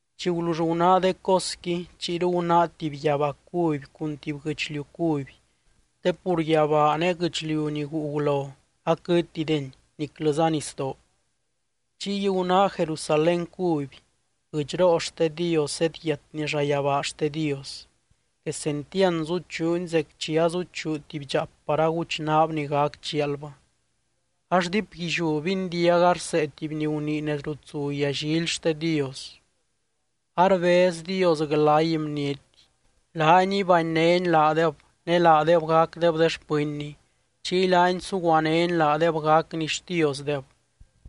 Chi gulull gunáa de cosqui, chiyru gunáa tuby yabaa cuby cun tuby guɨchliu cuby, te pur yabaa ne guɨchliu ni guu gulo aquɨtideni, niclɨza nisdoo. Chiy gunáa Jerusalén cuby, guɨdxroo xte Dios zedyiatni llayabaa xte Dios. Quesentiand zuchuuni zec chi azuchuu tuby dxaap par aguchnaab ni gac chialbɨ. Ax diipguilliú bindiaga rsee tuby ni gunii nez rut zu yallily xte Dios: —Arbez Dios glay bniety. Laany ibanynény laadeb ne laadeb gacdeb de xpɨnny, chiy laany suguanény laadeb gacny Xtiosdeb.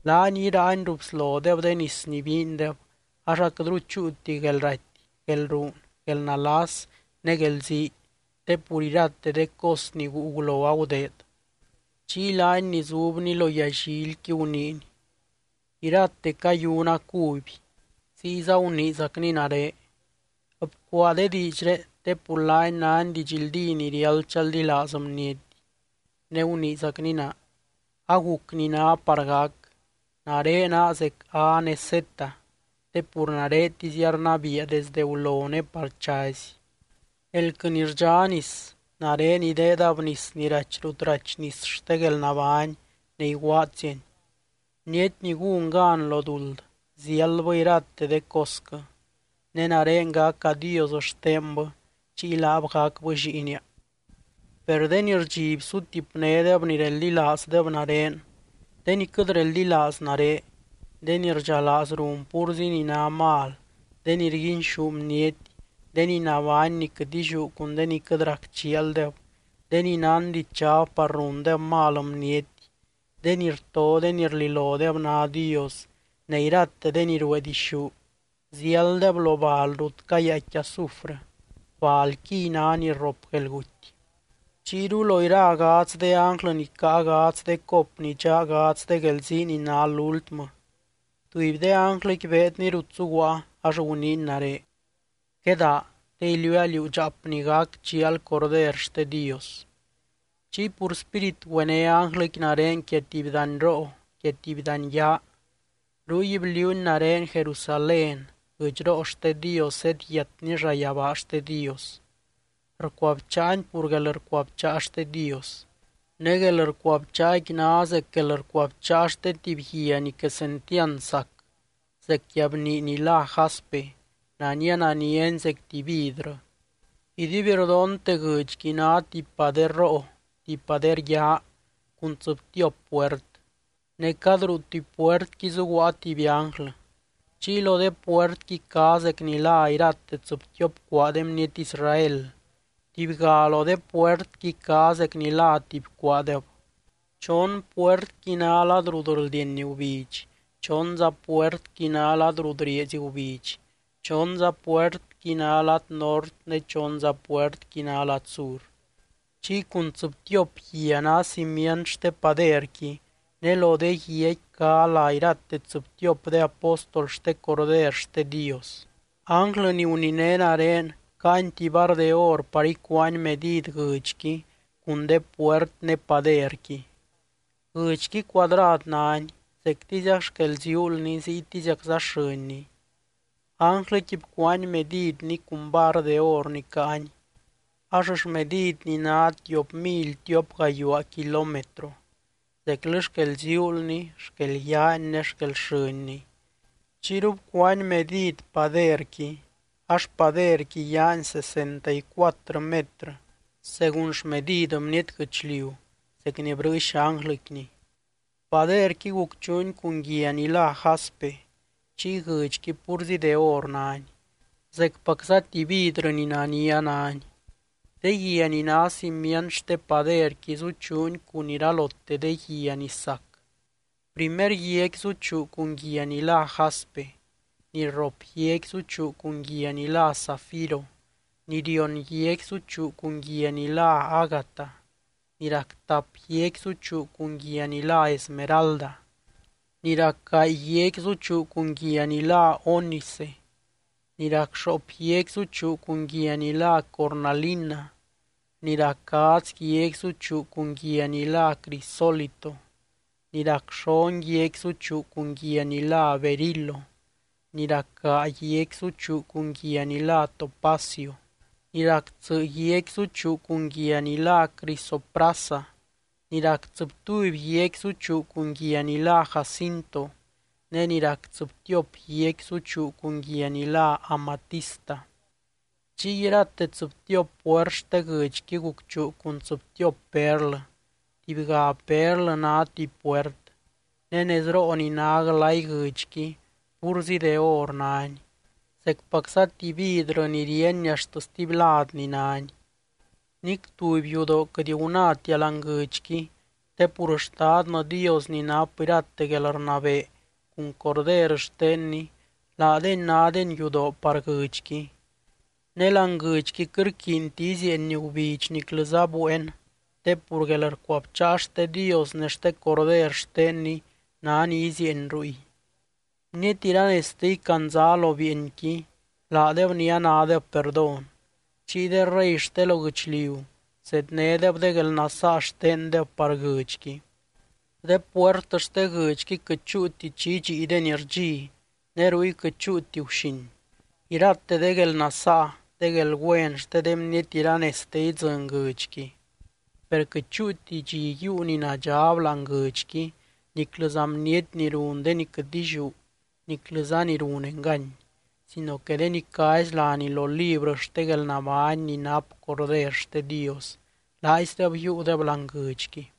Laany iraany ruu bslodeb de nis ni biindeb, ax aquɨtru chúuti guelraty, guelruun, guelnalas ne guelzii, te pur irate de cos ni guu gulo agudeed. Chiy laany ni zubny lo yallilqui guniiny: —Irate cayuna cuby. Ziyza guniizacny nare: —Bcuaa de diidxré, te pur laani náni didxldí ni riáld chaldilaaz bniety. Ne guniizacny naa: —Aguc ni ná par gac. Nare naa zec A ne Z, te pur naretizia rnabiia desdɨ gulo ne par chazy. Elquɨ ni rdxá nis, nare ideedab nis ni rachy rut rachy nis xte guelnabány ne iguaadziani. Bniety ni gún gan lo duld, ziáldbɨ irate de cosquɨ. Ne nare gaca Dios xtenbɨ, chiy laab gacbɨ lliinia. Per de ni rdxiby sutipnédeb ni reldilaazdeb nare, de ni quɨt reldilaaz nare, de ni rdxalaaz run púrzi ni ná mal, de ni rguinxú bniety, de ni nabány ni quɨt illiú cun de ni quɨt rac chialdeb, de ni nán dichab par rundeb mal bniety, de ni rto de ni rlilodeb ná dios, ne irate de ni ruee dixú, ziálddeb lo bal rut cayaaicqui azufrɨ, balquiy ná ni rrop guelguty. Chiyru lo ira gadz de ánglɨ ni caa gadz de cop ni dxa gadz de guelzii ni ná lúltmɨ, tuby de ánglɨqui beedny rut zuguaa, ax guniiny nare: —Quedaa, te iliuua liú dxaap ni gac chial Corder xte Dios. Chiy pur Spírit güené ánglɨqui nare quia tuby danyroo, quia tuby dany yaa. Ruy bliuuny nare Jerusalén, guɨdxroo xte Dios zedyiatni llayabaa xte Dios. Rcuabcháani pur guelrcuabcháa xte Dios. Ne guelrcuabcháaqui ná zec guelrcuabcháa xte tuby guia ni quesentiand sac, zec guiabnii ni lá jaspe, nania naniani zec tuby vidrɨ. Iduibrdonte guɨdxqui ná tuby pader roo, tuby pader yaa cun tsɨbtiop puert, ne cad ruu tuby puertqui zuguaa tuby ánglɨ. Chiy lo de puertqui cá zec ni lá irate tsɨbtiop cuaa de bniety Israel, tubyga lo de puertqui cá zec ni lá tuby cuaadeb. Chon puertqui ná lad rut rldieny gubidx, chonza puertqui ná lad rut rieezy gubidx, chonza puertqui ná lad nort ne chonza puertqui ná lad sur. Chiy cun tsɨbtiop guia ná cimient xte paderqui, ne lo de guiaqui cá lá irate tsɨbtiop de apóstol xte Corder xte Dios. Ánglɨ ni guniné nare caany tuby var de or par ícuaany medid guɨdxqui cun de puert ne paderqui. Guɨdxqui cuadrad náni, zectiziac xquel ziuulni ziytiziacza xɨnni. Ánglɨqui bcuaany medidni cun var de or ni caany, ax xmedidni ná tiop mily tiop gayuaa kilómetro, zeclɨ xquel ziuulni, xquel yaani ne xquel xɨnni. Chiyru bcuáab medid paderqui, ax paderqui yaani sesenta y cuatrɨ metrɨ según xmedid bniety guɨchliu zec ni brɨɨx ánglɨquini. Paderqui gucchuuni cun guia ni lá jaspe, chiy guɨdxqui púrzi de or náni, zecpacza tuby vidrɨ ni nania náni. De guia ni ná cimient xte paderqui zuchuuni cun iralote de guia ni sac. Primer guiaqui zuchuu cun guia ni lá jaspe, ni rrop guiaqui zuchuu cun guia ni lá zafiro, ni rion guiaqui zuchuu cun guia ni lá ágata, ni rac tap guiaqui zuchuu cun guia ni lá esmeralda, ni rac gaay guiaqui zuchuu cun guia ni lá ónice, ni rac xoop guiaqui zuchuu cun guia ni lá cornalina, ni rac gadz guiaqui zuchuu cun guia ni lá crisólito, ni rac xon guiaqui zuchuu cun guia ni lá berilo, ni rac gaa guiaqui zuchuu cun guia ni lá topacio, ni rac tsɨ guiaqui zuchuu cun guia ni lá crisoprasa, ni rac tsɨbtuby guiaqui zuchuu cun guia ni lá jacinto, ne ni rac tsɨbtiop guiaqui zuchuu cun guia ni lá amatista. Chiy irate tsɨbtiop puert xte guɨdxqui gucchuu cun tsɨbtiop perlɨ, tubyga perlɨ ná tuby puert. Ne nezroo ni ná glay guɨdxqui púrzi de or náni, zecpacza tuby vidrɨ ni ríeny axt stuby ladni náni. Nic tuby yudoo quɨt gunáatia láani guɨdxqui te pur Xtadnɨ Dios ni nap irate guelrnabee cun Corder xtenny, laadeny nádeny yudoo par guɨdxqui. Ne láani guɨdxqui quɨt rquiinti izieeny gubidx niclɨza bueen, te pur guelrcuabcháa xte Dios ne xte Corder xtenny ná ni izieeny ruy. Bniety iranezte icandzá lo bieenqui, laadeb ni anádeb perdón. Chiy de rey xte lo guɨchliu zednédeb de guelnasaa xtendeb par guɨdxqui. De puert xte guɨdxqui quɨt chúuti chi idxiideni rdxi, ne ruy quɨt chúuti guxin. Irate de guelnasaa, de guelgüen xte de bniety iranezte idzɨny guɨdxqui. Per quɨt chúuti dxi yiiu ni nadxab láani guɨdxqui niclɨza bniety ni run de ni quɨt illiú niclɨza ni run engany, sino que de ni cázy láni lo librɨ xte guelnabány ni nap Corder xte Dios, laaizdeb yiiudeb láani guɨdxqui.